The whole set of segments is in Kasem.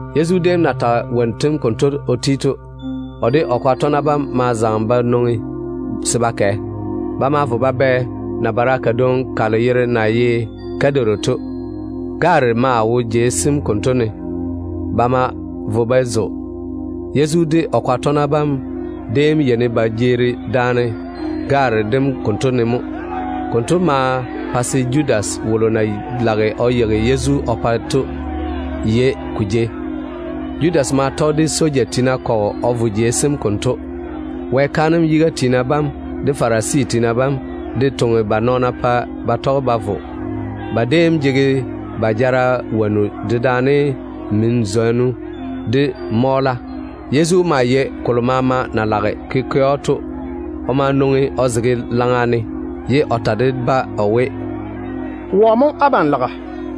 Yezu déem na tage wonnu tem konto o ti to, o de o tɔgena bam ma zaŋe ba nwoŋi se ba kɛ. Ba ma vo ba bɛ nabara kadwoŋi kalo yere na ye Kidoron to. Gaare maa wo jei sem konto ne. Ba ma vo ba zo de wone. Yezu de o kwaga tɔgena bam déem yeini ba jeeri daane gaare dem konto ne mo. Konto ma pa se Judas wolo na lage o yeigi Yezu o pa to yei ko jei. Judas ma tɔge de soja tiina kɔgɔ o vo jeiga kam konto. Wɛ kaanem yiga tiina bam de Farisi tiina bam de ma toŋe ba nɔɔna pa ba tɔge ba vo. Ba déem jege ba jara zela, dedaane min-zwonnu, de mɔɔla. Yezu maa yei kolo maama na lage ko ke‑o to. O ma fɔɔre o twɛ ba tei, ye o ta de-ba o we, “Wɔ mo abam laga?”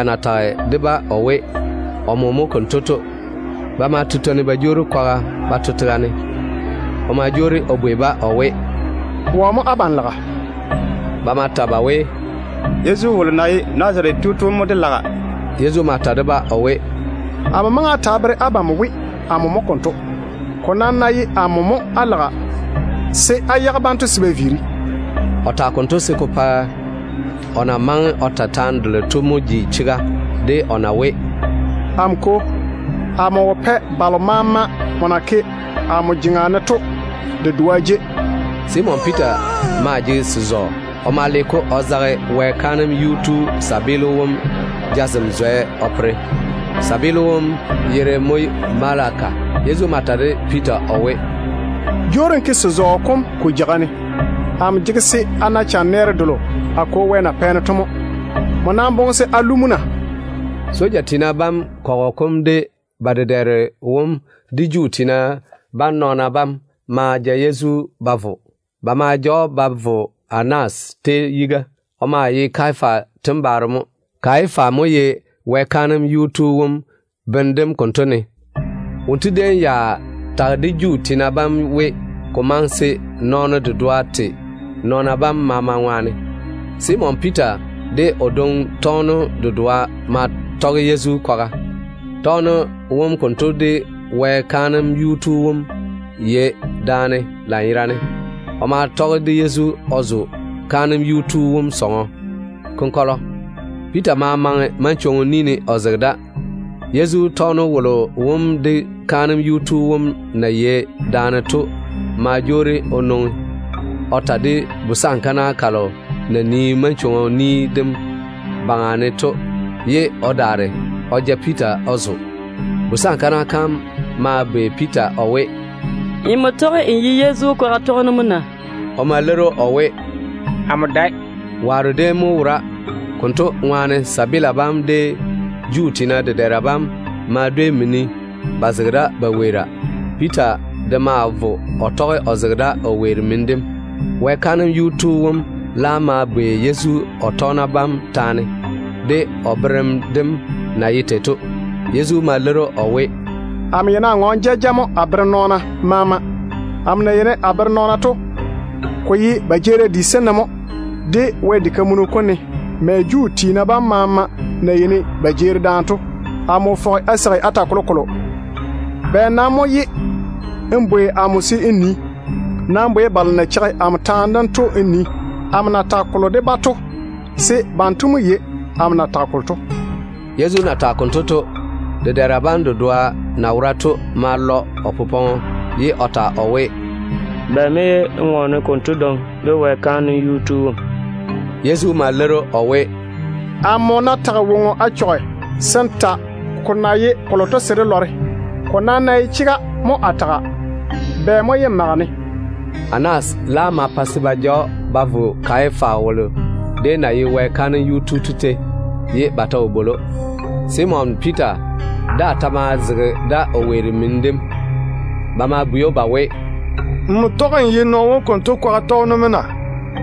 Yezu na tage de-ba o we wom mo konto to, ba ma tutwoni ba jwoori kwaga ba to tega ne. O ma jwoori o bwei-ba o we, “Wɔ mo abam laga?” Ba ma ta ba we, “Yezu wolo na ye Nazarete tu to mo dé laga.” Yezu ma ta de-ba o we, “Amo maŋe a ta a bere abam we, amo mo konto. Ko nam ná ye amo mo á laga, se á yage banto se ba viiri.” O tage konto se ko pa o na maŋe o ta taane delo to mo ji chega de o na we, “Amo Kwo, amo wo pɛ balo maama nmo na ke amo jeŋa ne to de dedoa de jei.” Simon Piita maa jege se-zɔɔ. O ma le-ko o ma o zage Wɛ kaanem yuu tu wom tontoŋeno jazem zwɛ o pere. Tontoŋeno wom yere mo Malachu. Yezu ma ta de Piita o we, “Jwoori n ke n seo kom ko pwolo ne. Amo jege se a na chanɛɛre delo a Kwo na pɛ-ne to mo. Nmo nam boŋe se a lu mo na?” Soja tiina bam kɔgɔ kom de ba dedɛɛro wom de Juu tiina bam nɔɔna bam ma ja Yezu ba vɔ. Ba ma ja‑o ba da yiga ba vo Anas tei. O maa ye Kayafa tembaaro mo. Kayafa mo ye Wɛ kaanem yuu tu wom bene dem konto ne. Wonto déem ya tage de Juu tiina bam we, ko maŋe se nɔɔno dedoa te nɔɔna bam maama ŋwaane. Simon Piita de o dwoŋi tɔgeno dedoa ma tɔge Yezu kwaga. Tɔgeno wom konto de Wɛ kaanem yuu tu wom yei daane lanyerane. O ma tɔge de Yezu o zo kaanem yuu tu wom sɔŋɔ konkɔlɔ. Piita ma maŋe manchwoŋo ni ne o zege da. Yezu tɔgeno wolo wom de kaanem yuu tu wom na yei daane to ma jwoori o nwoŋi o ta de busankana kalo na nii manchwoŋo ni dem baŋa ne to, ye o daare o ja Piita o zo. Busankana kam ma bwei Piita o we, “Nmo tɔge n ye Yezu kwaga tɔgeno mo na?” O ma leiri o we, “Amo dae.” Waaro déem mo wora. Konto ŋwaane tontoŋena bam de Juu tiina dedɛɛra bam ma dwei mini ba zege da ba weera. Piita de ma vo o tɔge o zege da o weeri mini dem. Wɛ kaanem yuu tu wom laam ma bwei Yezu o tɔgena bam taane, de o berem dem na ye tei to. Yezu ma leiri‑o o we, “Amo yeini a ŋɔɔne jaja mo a bere nɔɔna maama. Amo na yeini a bere nɔɔna to, ko ye ba jeerim di sem ne mo, de Wɛ diga kam ne, mɛ Juu tiina bam maama na yeini ba jeeri daane to. Amo wo fɔge a seigi a ta kolokolo. Bɛ nam mo ye n bwei amo se n nii? Nam bwei balo na cheigi amo bera yam to n nii amo na tage kolo de-ba to, se banto mo yei amo na tage kolo to.” Yezu na tage konto to, dedɛɛra bam dedoa na zege o takeiri ne to ma lɔ o popɔŋɔ, ye o bwei‑o o we, “Bɛ mo ye n ŋɔɔne konto dwoŋi de Wɛ kaanem yuu tu wom?” Yezu ma leiri‑o o we, “Amo ná tage woŋo a chɔge, se n ta ko na ye kolo to se dé lɔre. Ko nam ná ye chega mo a taga, bɛ mo ye n mage-ne?” Anas laam ma pa se ba ja‑o ba vo Kayafa wolo na ye Wɛ kaanem yuu tu to tei, ye ba ta wo bwoli‑o. Simon Piita daa ta maa zege da o weeri mini dem. Ba ma bwei‑o ba we, “Nmo tɔge n ye nɔɔno wonto kwaga tɔgeno mo na?”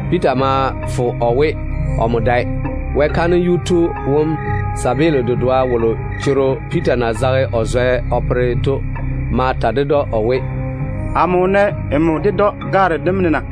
Piita ma fo o we, omo dae. Wɛ kaanem yuu tu wom tontoŋeno dedoa wolo choro Piita na zage o zwɛ o pere to ma ta ded‑o o we, “Amo wo nɛ nmo ded‑o gaare dem ne na?”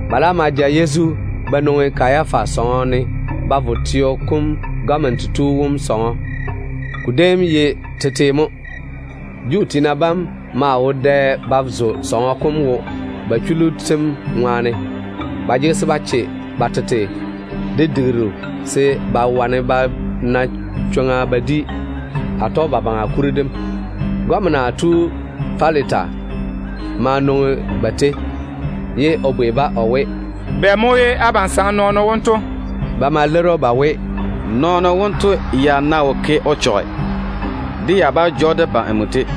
Ba laam ma ja Yezu ba nwoŋi Kayafa sɔŋɔ ne ba vo teo kom gɔmena tu wom sɔŋɔ. Ko déem ye tetete mo. Juu tiina bam maa wo dɛ ba zo sɔŋɔ kom wo ba chullu tem ŋwaane. Ba jege se ba che ba tete de digiru se ba wane ba na chwoŋa ba di Atɔgebabaŋa kuri dem. Gɔmena tu Pilata ma nwoŋi ba tei, ye o bwei-ba o we, “Bɛ mo ye abam saŋe nɔɔno wonto?” Ba ma leiri‑o ba we, “Nɔɔno wonto ya ná wo ke o chɔge, dé ya bá ja‑o dé ba nmo tei.”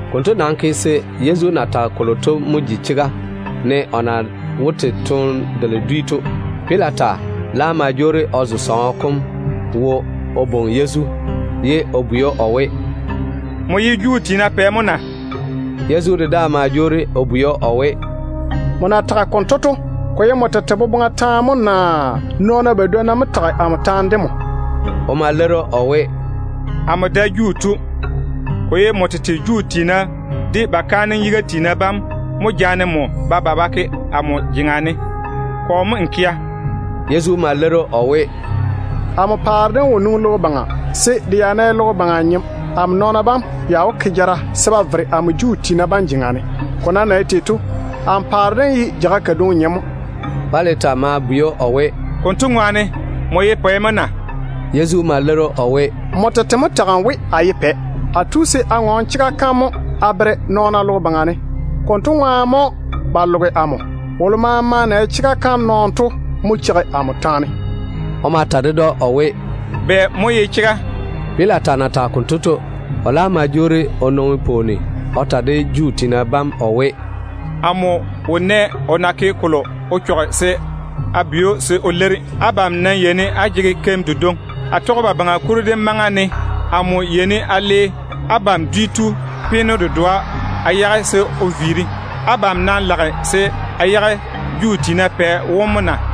Konto nam ke se Yezu na tage kolo to mo ji chega, ne o na wó te toone delo dwi to. Pilata laam ma jwoori o zo sɔŋɔ kom wo o bwoŋi Yezu, ye o bwei‑o o we, “Nmo ye Juu tiina bam pɛ mo na?” Yezu de daa ma jwoori o bwei‑o o we, “Nmo na tage konto to, ko ye nmo tete boboŋa taane mo naa nɔɔna badwonna mo tage amo taane de nmo?” O ma leiri o we, “Amo dae Juu tu. Ko ye nmo tete Juu tiina de ba kaanem yiga tiina bam mo jaane nmo ba ba ba ke amo jeŋa ne. Kɔ mo n kea?” Yezu ma leiri o we, “Amo paare dem wo nwoŋi logo baŋa, se de ya ná ye logo baŋa nyem, amo nɔɔna bam ya wó ke jara se ba che se Juu tiina bam yé na chwoŋa se ba ja amo. Ko nam na ye tei to, amo paare dem ye jeiga kadwoŋi nyem mo.” Pilata ma bwei‑o o we, “Konto to, nmo ye pɛ mo na?” Yezu ma leiri o we, “Nmo tete mo tage n we, a ye pɛ. A tu se a ŋɔɔne chega kam taane mo a bere nɔɔna logo baŋa ne. Konto ŋwaane mo ba loge amo. Wolo maama na ye chega nɔɔno to mo cheigi amo taane.” O ma ta ded‑o o we, “Bɛ mo ye chega?” Pilata na tage konto to, o laam ma jwoori o nwoŋi pwooni o ta de Juu tiina bam o we, “Amo wo nɛ o na ke kolo o chɔge to se a bwei‑o se o leiri. Abam nam yeini á jege meo kodwoŋi. Atɔgebabaŋa kuri dem maŋa ne amo yeini a le peeno dedoa a yage a pa abam se o viiri. Abam nam lage se a yage Juu tiina pɛ wom mo na?”